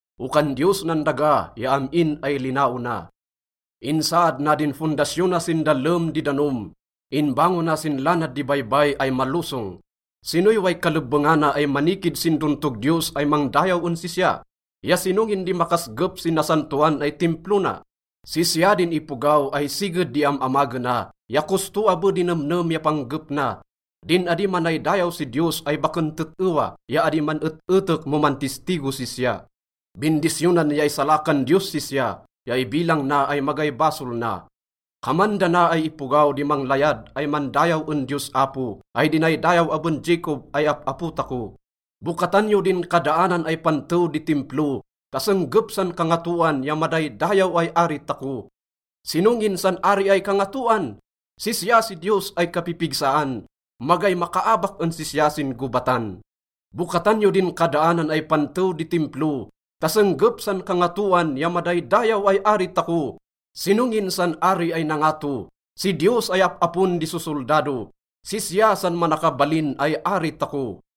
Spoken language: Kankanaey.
Okan Diyos nan daga ya am-in ay linaona. Insaad na din fondasyona sin dallem di danom, inbangona sin lanad di baybay ay malosong. Sinoy way kalebbengana ay manikid sin dontog Diyos ay mangdayaw en sisya? Ya sino ngin di makasgep sin nasantoan ay Timplo na? Sisya din ipogaw ay siged di am-amagena, ya kosto abe di nemnem ya panggep na, din adi manaydayaw si diyos ay baken tet-ewa, ya adi man-et-etek mo mantistigo sisya. Bindisyonan ya isalakan Diyos sisya ya ibilang na ay magay basol na. Kaman dana ay ipogaw di manglayad ay mandayaw en Diyos Apo ay dinaydayaw aben Jacob ay ap-apo tako. Bokatan yo din kadaanan ay pantew di Timplo ta senggep san kangatoan ya madaydayaw ay Ari tako! Sino ngin san Ari ay kangatoan? Sisya si Diyos ay kapipigsaan, magay makaabak en sisya sin gobatan. Bokatan yo din kadaanan ay pantew di Timplo ta senggep san kangatoan ya madaydayaw ay Ari tako! Sino ngin san Ari ay nangato? Si Diyos ay ap-apon di sosoldado, sisya san manakabalin ay Ari tako.